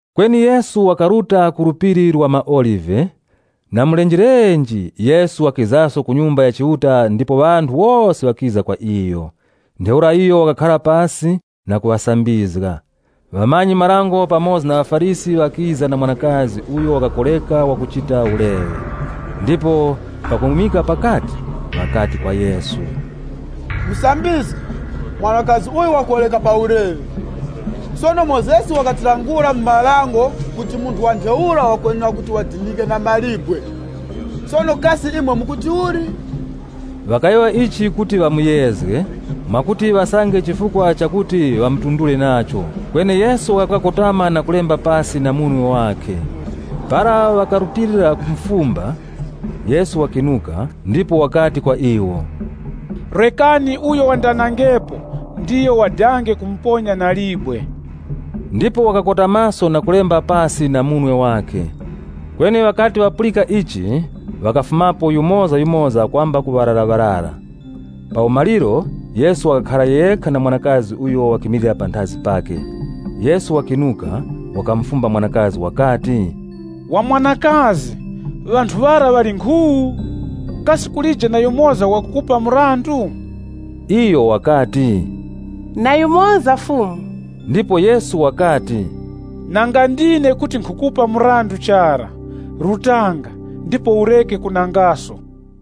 Kweni Yesu wakaruta ku Phiri la maOlive. Na mulenjelenje, Yesu wakizaso ku Nyumba ya Chiuta ndipo ŵanthu wose ŵakiza kwa iyo. Ntheura iyo wakakhara pasi na kuŵasambizga. Ŵamanyi-marango pamoza na ŵaFarisi ŵakiza na mwanakazi uyo wakakoreka wakuchita uleŵe, ndipo pakumwimika pakati, ŵakati kwa Yesu, “Musambizgi, mwanakazi uyu wakoreka pa uleŵe. Sono Mozesi wakatilangula mu Dango kuti munthu wa ntheura wakwenera kuti wadinike na mawe. Sono kasi imwe mukuti uli?” Ŵakayowoya ichi kuti ŵamuyezge, mwakuti ŵasange chifukwa chakuti ŵamutundure nacho. Kweni Yesu wakakotama na kulemba pasi na munwe wakhe. Para ŵakarutilira kumufumba, Yesu wakinuka ndipo wakati kwa iwo, “Rekani uyo wandanangepo ndiyo wadange kumuponya na libwe.” Ndipo wakakotamaso na kulemba pasi na munwe wakhe. Kweni ŵakati ŵapulika ichi ŵakafumapo yumozayumoza kwamba na ŵararaŵarara. Pa umaliro Yesu wakakhara yekha na mwanakazi uyo wakimilira panthazi pakhe. Yesu wakinuka, wakamufumba mwanakazi wakati, “Wa mwanakazi, kasi ŵanthu ŵara ŵali nkhu? Kasi kulije na yumoza wakukupa mrandu?” Iyo wakati, “Na yumoza Fumu.” Ndipo Yesu wakati, “Nanga ndine kuti nkhukupa mrandu chara. Rutanga, ndipo ureke kunangaso.”]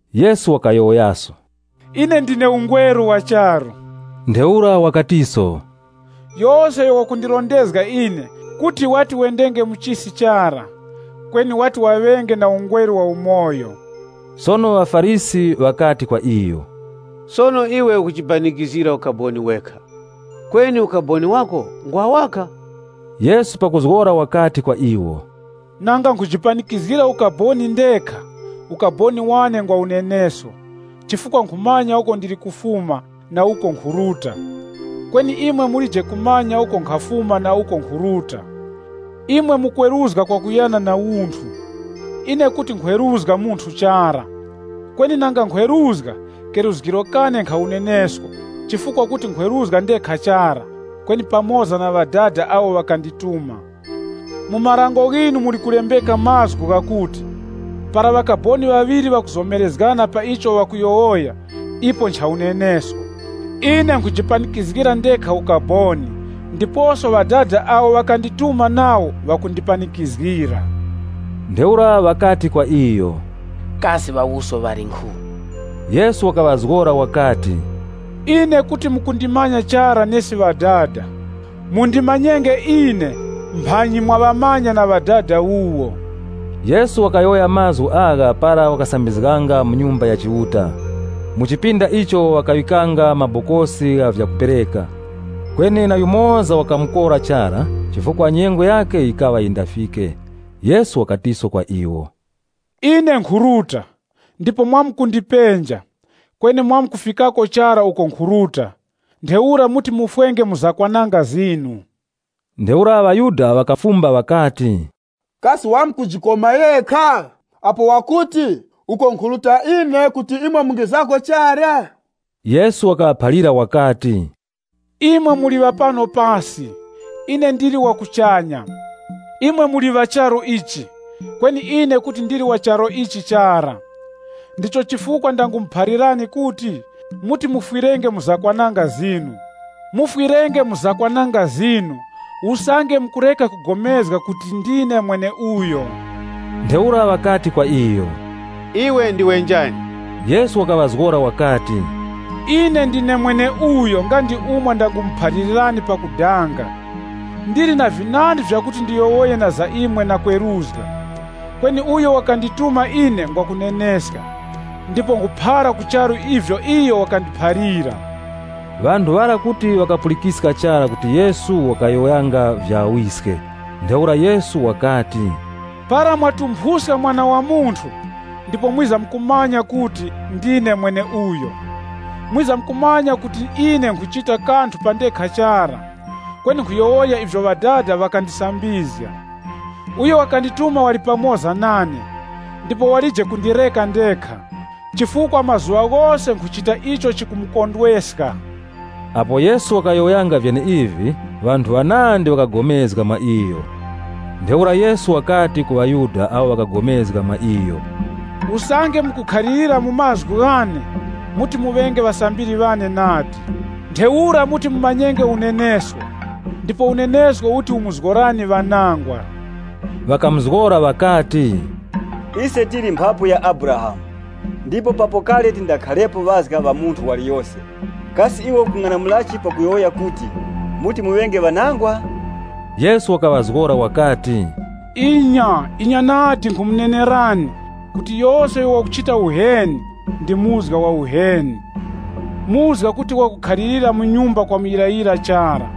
Yesu wakayowoyaso wakati, “Ine ndine ungweru wa charu. Yose uyo wakundirondezga ine kuti wati wendenge mu chisi chara, kweni wati waŵenge na ungweru wa umoyo.” Sono ŵaFarisi ŵakati kwa iyo, “Sono iwe ukujipanikizgira ukaboni wekha, kweni ukaboni wako ngwa waka.” Yesu pakuzgora wakati kwa iwo, “Nanga nkhujipanikizgira ukaboni ndekha, ukaboni wane ngwa unenesko, chifukwa nkhumanya uko ndili kufuma na uko nkhuruta. Kweni imwe mulije kumanya uko nkhafuma na uko nkhuruta. Imwe mukweruzga kwakuyana na unthu. Ine kuti nkhweruzga munthu chara. Kweni nanga nkhweruzga, keruzgiro kane nkha unenesko chifukwa kuti nkhweruzga ndekha chara, kweni pamoza na Ŵadada awo ŵakandituma. Mu marango ghinu muli kulembeka mazgu ghakuti, ‘Para ŵakaboni ŵaŵiri ŵakuzomerezgana pa icho ŵakuyowoya ipo ncha unenesko.’ Ine nkhujipanikizgira ndekha ukaboni ndiposo Ŵadada awo ŵakandituma nawo ŵakundipanikizgira.” Ntheura ŵakati kwa iyo, “Kasi Ŵawuso ŵali nkhu?” Yesu wakaŵazgora wakati, “Ine kuti mukundimanya chara nesi Ŵadada. Mundimanyenge ine mphanyi mwaŵamanya na Ŵadada wuwo.” Yesu wakayowoya mazgu agha para wakasambizganga mu Nyumba ya Chiuta, mu chipinda icho ŵakaŵikanga mabokosi gha vyakupereka. Kweni na yumoza wakamukora chara chifukwa nyengo yakhe yikaŵa yindafike. Yesu wakatiso kwa iwo, “Ine nkhuruta, ndipo mwamkundipenja, kweni mwamkufikako chara uko nkhuruta. Ntheura muti mufwenge mu zakwananga zinu.” Ntheura ŵaYuda ŵakafumba ŵakati, “Kasi wamkujikoma yekha? Apo wakuti, ‘Uko nkhuruta ine kuti imwe mungizako chara?’” Yesu wakaŵaphalira wakati, “Imwe muli ŵa pano pasi, ine ndili wa kuchanya. Imwe muli ŵa charu ichi, kweni ine kuti ndili wa charu ichi chara. Ndicho chifukwa ndangumuphalirani kuti, muti mufwirenge mu zakwananga zinu. Mufwirenge mu zakwananga zinu, usange mukureka kupulikana kuti ‘Ndine mweneuyo.’” Ntheura ŵakati kwa iyo, “Iwe ndiwe njani?” Yesu wakaŵazgora wakati, “Ine ndine mweneuyo nga ndi umo ndangumuphalirani pakudanga. Ndili na vinandi vyakuti ndiyowoye na za imwe na kweruzga. Kweni uyo wakandituma ine ngwa kuneneska, ndipo nkhuphara ku charu ivyo iyo wakandiphalira.” Ŵanthu ŵara kuti ŵakapulikiska chara kuti Yesu wakayowoyanga vya Ŵawiske. Ntheura Yesu wakati, “Para mwatumphuska Mwana wa Munthu, ndipo mwizamkumanya kuti, Ndine mweneuyo. Mwizamkumanya kuti ine nkhuchita kanthu pa ndekha chara, kweni nkhuyowoya ivyo Ŵadada ŵakandisambizga. Uyo wakandituma wali pamoza nane. Ndipo walije kundireka ndekha, chifukwa mazuŵa ghose nkhuchita icho chikumukondweska.” Apo Yesu wakayowoyanga vyeneivi, ŵanthu ŵanandi ŵakapulikana mwa iyo. Ntheura Yesu wakati ku ŵaYuda awo ŵakapulikana mwa iyo, “Usange mukukhalirira mu mazgu ghane, muti muŵenge ŵasambiri ŵane nadi. Ntheura muti mumanyenge unenesko, ndipo unenesko uti umuzgorani ŵanangwa.” Ŵakamuzgora ŵakati, “Ise tili mphapu ya Abrahamu, ndipo papo kale tindakharepo ŵazga ŵa munthu waliyose. Kasi iwe ukung'anamulachi pakuyowoya kuti, muti muŵenge ŵanangwa?” Yesu wakaŵazgora ŵakati, “Inya, inya nadi, nkhumunenerani kuti yose uyo wakuchita uheni, ndi muzga wa uheni. Muzga kuti wakukhalira mu nyumba kwa muyirayira chara,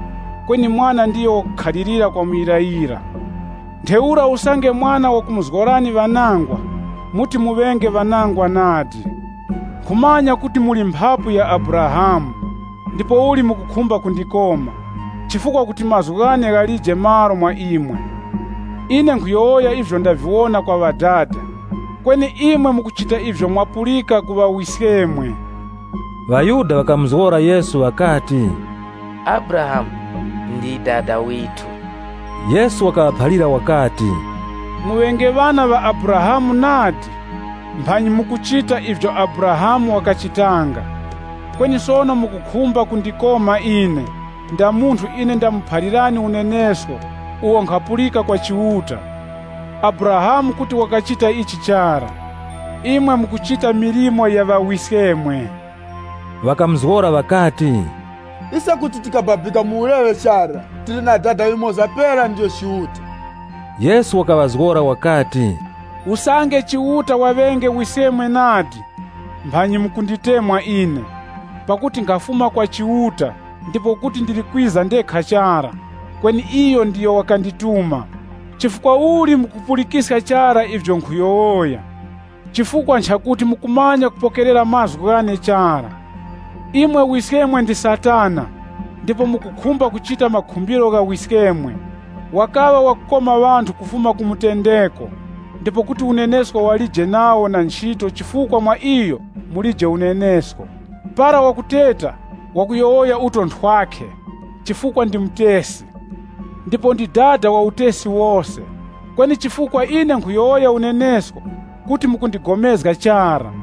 kweni mwana ndiyo wakukhalira kwa muyirayira. Ntheura usange Mwana wakumuzgorani ŵanangwa, muti muŵenge ŵanangwa nadi. Nkhumanya kuti muli mphapu ya Abrahamu, ndipouli mukukhumba kundikoma, chifukwa kuti mazgu ghane ghalije malo mwa imwe. Ine nkhuyowoya ivyo ndaviwona kwa Ŵadada. Kweni imwe mukuchita ivyo mwapulika ku ŵawiskemwe.” ŴaYuda ŵakamuzgora Yesu ŵakati, “Abrahamu ndi dada withu.” Yesu wakaŵaphalira wakati, “Muŵenge ŵana ŵa Abrahamu nadi, mphanyi mukuchita ivyo Abrahamu wakachitanga. Kweni sono mukukhumba kundikoma ine, nda munthu ine ndamuphalirani unenesko uwo nkhapulika kwa Chiuta. Abrahamu kuti wakachita ichi chara. Imwe mukuchita milimo ya wiskemwe.” Ŵakamuzgora ŵakati, “Ise kuti tikababika mu uleŵe chara, tili na Dada yumoza pera, ndiyo Chiuta.” Yesu wakaŵazgora wakati, “Usange Chiuta waŵenge Wiskemwe nadi, mphanyi mukunditemwa ine, pakuti nkhafuma kwa Chiuta ndipo kuti ndili kwiza ndekha chara, kweni iyo ndiyo wakandituma. Chifukwa uli mukupulikiska chara ivyo nkhuyowoya? Nchifukwa chakuti mukumanya kupokerera mazgu ghane chara. Imwe wiskemwe ndi Satana, ndipo mukukhumba kuchita makhumbiro gha wiskemwe. Wakaŵa wakukoma ŵanthu kufuma ku mutendeko ndipo kuti unenesko walije nawo na nchito chifukwa mwa iyo mulije unenesko. Para wakuteta, wakuyowoya uto nthwakhe, chifukwa ndi mutesi, ndipo ndi dada wa utesi wose. Kweni chifukwa ine nkhuyowoya unenesko, kuti mukupulikana nane chara!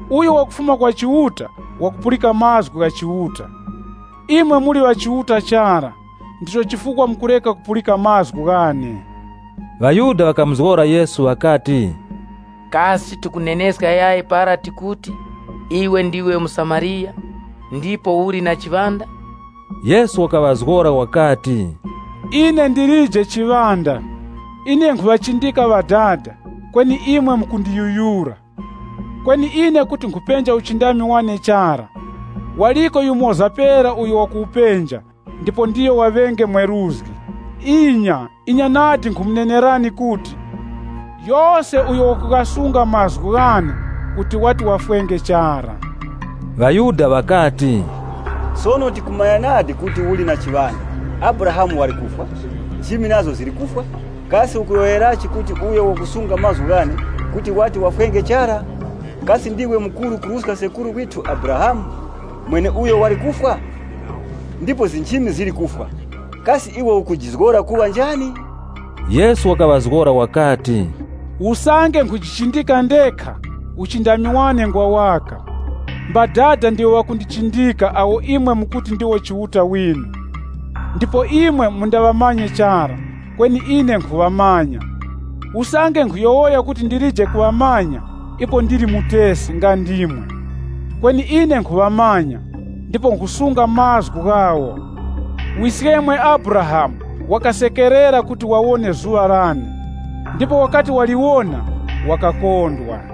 Uyo wakufuma kwa Chiuta, wakupulika mazgu gha Chiuta. Imwe muli ŵa Chiuta chara, ndicho chifukwa mukureka kupulika mazgu ghane.” ŴaYuda ŵakamuzgora Yesu ŵakati, “Kasi tikuneneska chara para tikuti, iwe ndiwe muSamariya, ndipouli na chiŵanda?” Yesu wakaŵazgora wakati, Ine ndilije chiŵanda. Ine nkhuŵachindika Ŵadada, kweni imwe mukundiyuyura. Kweni ine kuti nkhupenja uchindami wane chara, waliko yumoza pera uyo wakuwupenja ndipo ndiyo waŵenge mweruzgi. “Inya, inya nadi nkhumunenerani kuti, yose uyo wakughasunga mazgu ghane, kuti wati wafwenge chara.” ŴaYuda ŵakati, “Sono tikumanya nadi kuti uli na chiŵanda! Abrahamu wali kufwa, nchimi nazo zili kufwa, kasi ukuyowoyerachi kuti uyo wakusunga mazgu ghane kuti wati wafwenge chara? Kasi ndiwe mukuru kuruska sekuru withu Abrahamu mweneuyo wali kufwa? Ndipo nchimi zili kufwa! Kasi iwe ukujizgora kuŵa njani?” Yesu wakaŵazgora wakati, “Usange nkhujichindika ndekha, uchindami wane ngwa waka. Mbadada ndiwo ŵakundichindika awo imwe mukuti ndiwo Chiuta winu. Ndipo imwe mundaŵamanye chara, kweni ine nkhuŵamanya. Usange nkhuyowoya kuti ndilije kuŵamanya, ipo ndili mutesi nga ndimwe. Kweni ine nkhuŵamanya, ndipo nkhusunga mazgu ghawo. Wiskemwe Abrahamu wakasekerera kuti wawone zuŵa lane. Ndipo wakati waliwona, wakakondwa.”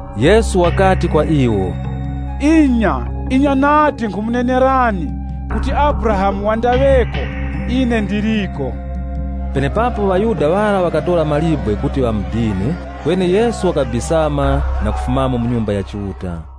Yesu wakati kwa iwo, “Inya, inya nadi, nkhumunenerani kuti Abrahamu wandaŵeko, Ndine.” Penepapo ŵaYuda ŵara ŵakatora mawe kuti ŵamudine, kweni Yesu wakabisama na kufumamo mu Nyumba ya Chiuta.